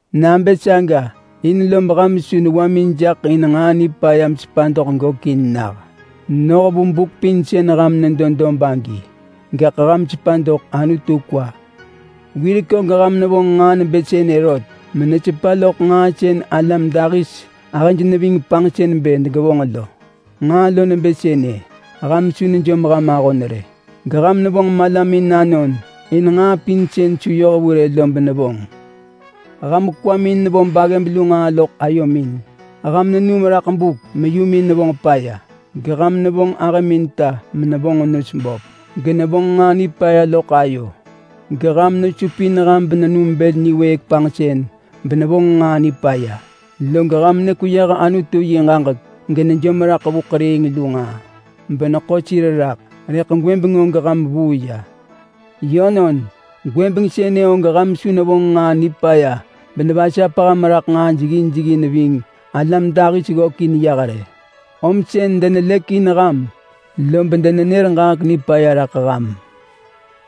Nabë saga, in lob ham su newamin jaḳ in nġaa nipaya mesepa doḳ gökin nah noh vu buk pin sën ham medo dob agi. Gaḳ ham sepa doḳ Anutu kwa. Wirek og ham nevonġ nġaa nebë sënë rot menesepa loḳ nġaa sën alam dahis ahëj neving panġsën bë degevonġ lo. Nġaa lo nebë sënë: Ham su nejom ham ahon rë, geham nevonġ malamin anon in nġaa pin sën su yoh vu rë lo benevonġ. Ham kwamin nevo baggëb lu nġaa loḳ ayomin; ham nenum raḳ buk meyumin nevonġ paya; geham nevonġ ahëmin ta menevonġ nos böp genevonġ nġaa nipaya loḳ ayo; geham nesupin ham benenum bël niwëëk panġsën benevonġ nġaa nipaya; log ham nekweyëh Anutu yi ġaġek genejom raḳ vu ḳeriing lu nġaa beneḳo sir raḳ. Rëḳ gwëbeng og ham vuu ya. Yönon, gwëbeng sënë og ham su nevonġ nġaa nipaya benevasap ham raḳ nġaa jeggin jeggin ving alam dahis ggökin yah rë. Om sën denelëk in ham, lob denenër ġaġek nipaya raḳ ham.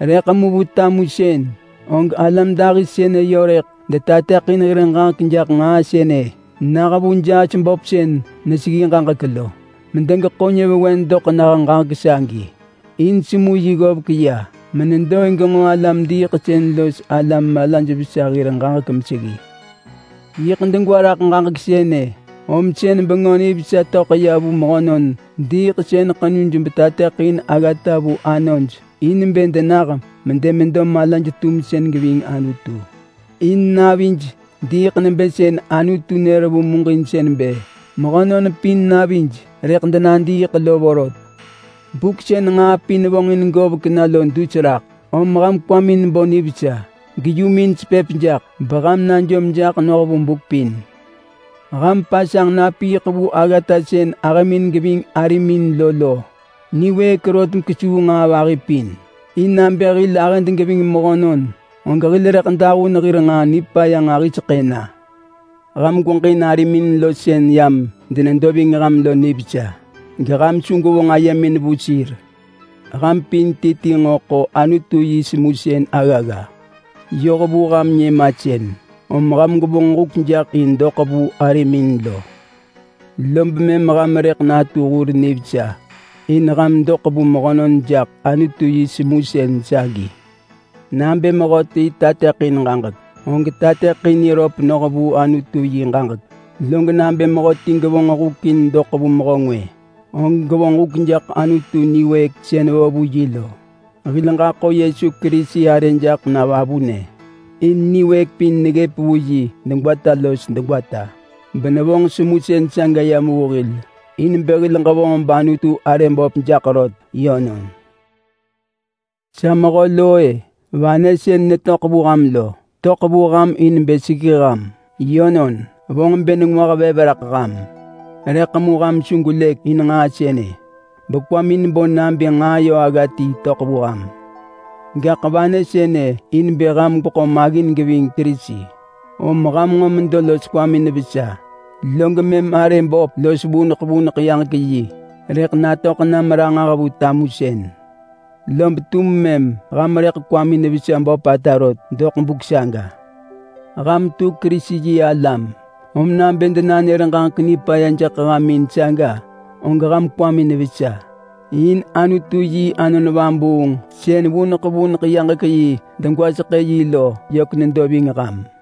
Rëḳ mu vu tamusën og alam dahis sënë yö rëḳ detateḳin hir ġaġek jaḳ nġaa sënë nah vu jaas böp sën neseggi ġaġek lo medegeḳo nyëvewen doḳ nah ġaġek sagi. In semu yi ggovek ya menedo in genġo alam-diiḳsën los alam malaj vesa hir ġaġek meseggi. Yiḳ degwa raḳ ġaġek sënë om sën Bengö Nivesa töḳ ya vu mehönon diiḳsën ḳenuj betateḳin aggata vu anoj in bë denah medemedo malaj-tumsën geving Anutu. In navij diiḳ nebë sën Anutu nër vu muġinsën bë mehönon pin navij rëḳ denadiiḳ lo vorot. Buk sën nġaa pin vonġin govek na lo dus raḳ, om ham kwamin bo nivesa, geyumin sepëp jaḳ, beham najom jaḳ noh vu buk pin. Ham pasanġ napiiḳ vu aggata sën ahëmin geving arimin lo lo niwëëk rot kesuu nġaa vahi pin. In nabë hil ahëd geving mehönon, og hil rëḳ dahun hir nġaa nipaya nġahiseḳë na. Ham gweġin arimin lo sën yam denedo ving ham lo nivesa, geham su gwevonġ ayemin vu sir. Ham pin ti ti nġo ḳo Anutu yi semusën aggagga yoh vu ham nyëmasën, om ham gwevonġ huk jaḳ in doḳ vu arimin lo. Lob mëm ham rëḳ natu hur nivesa in ham doḳ vu mehönon jaḳ Anutu yi semusën sagi. Nabë mehöti tateḳin ġaġek, og tateḳin niröp noh vu Anutu yi ġaġek. Log nabë mehöti gevonġ huk in doḳ vu mehö ngwë, og gevonġ huk jaḳ Anutu niwëëk sën vo vu yi lo. Hil ġaḳo Yesu Kerisi arë jaḳ na vavunë. In niwëëk pin neggëp vu yi degwata los degwata benevonġ semusën saga yam vu hil in bë hil ġevonġ bAnutu arë böp jaḳ rot. Yönon. Sa mehö lo-e! Vanë sën netöḳ vu ham lo, töḳ vu ham in bë seggi ham. Yönon, vonġ bë nengwah vev raḳ ham, rëḳ mu ham su gwelëk in nġaa sënë bekwamin bo nabë nġaa yö agga ti töḳ vu ham. Gaḳ vanë sënë in bë ham gweḳo maggin geving Kerisi. Om ham nġo medo los kwamin vesa, log mëm arë böp los vuneḳ vuneḳ yaġek yi rëḳ natöḳ nam ranġah vu tamusën. Lob tum mëm ham rëḳ kwamin vesa böpata rot doḳ buk saga. Ham tu Kerisi-yi-alam, om nabë denanër ġaġek nipaya jaḳ ham in saga, og ham kwamin vesa. In Anutu yi Anon Vabuung sën vuneḳ vuneḳ yaġek yi degwaseḳë yi lo yök nedo ving ham.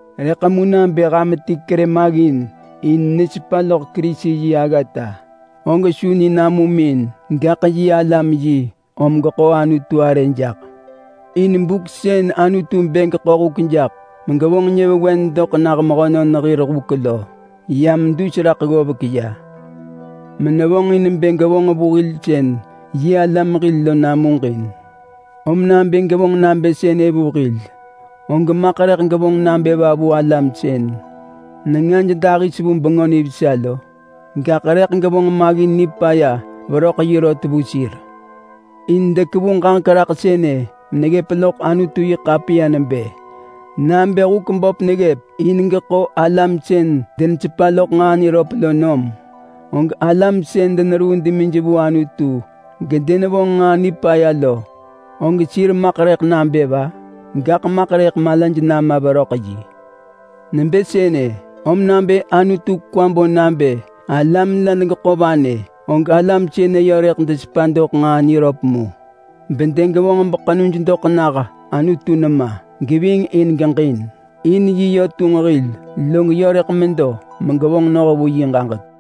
Rëḳ mu nabë ham ti kerë maggin in nesepa loḳ Kerisi yi aggata, og su ni namum in, gaḳ yi alam yi om geḳo Anutu arë jaḳ. In buk sën Anutu bë geḳo huk jaḳ megevonġ nyëvewen doḳ nah mehönon hir huk lo yam dus raḳ ggovek ya, menevonġin bë gevonġ vu hil sën yi alam hil lo namuġin. Om nabë gevonġ nabë sënë vu hil, og maḳ rëḳ gevonġ nabë va vu alam sën nengaj dahis vu Bengö Nivesa lo? Gaḳ rëḳ gevonġ maggin nipaya veröḳ yi rot vu sir! In dekevu meneggëp loḳ Anutu-yi-ḳapiya nebë: “Nabë huk böp neggëp in geḳo alam sën denesepa loḳ nġaa niröp lo nom, og alam sën deneruu demij vu Anutu gedenevonġ nġaa nipaya lo og sir maḳ rëḳ nabë va?” Gaḳ maḳ rëḳ malaj nama veröḳ yi. Nebë sënë, om nabë Anutu kwa bo nabë alam la degeḳo vanë, og alam sënë yö rëḳ desepa doḳ nġaa niröp mu, gedegevonġ beḳenuj doḳ nah Anutu nema geving in geġin. In yi yö tunġ hil, log yö rëḳ medo megevonġ noh vu yi ġaġek.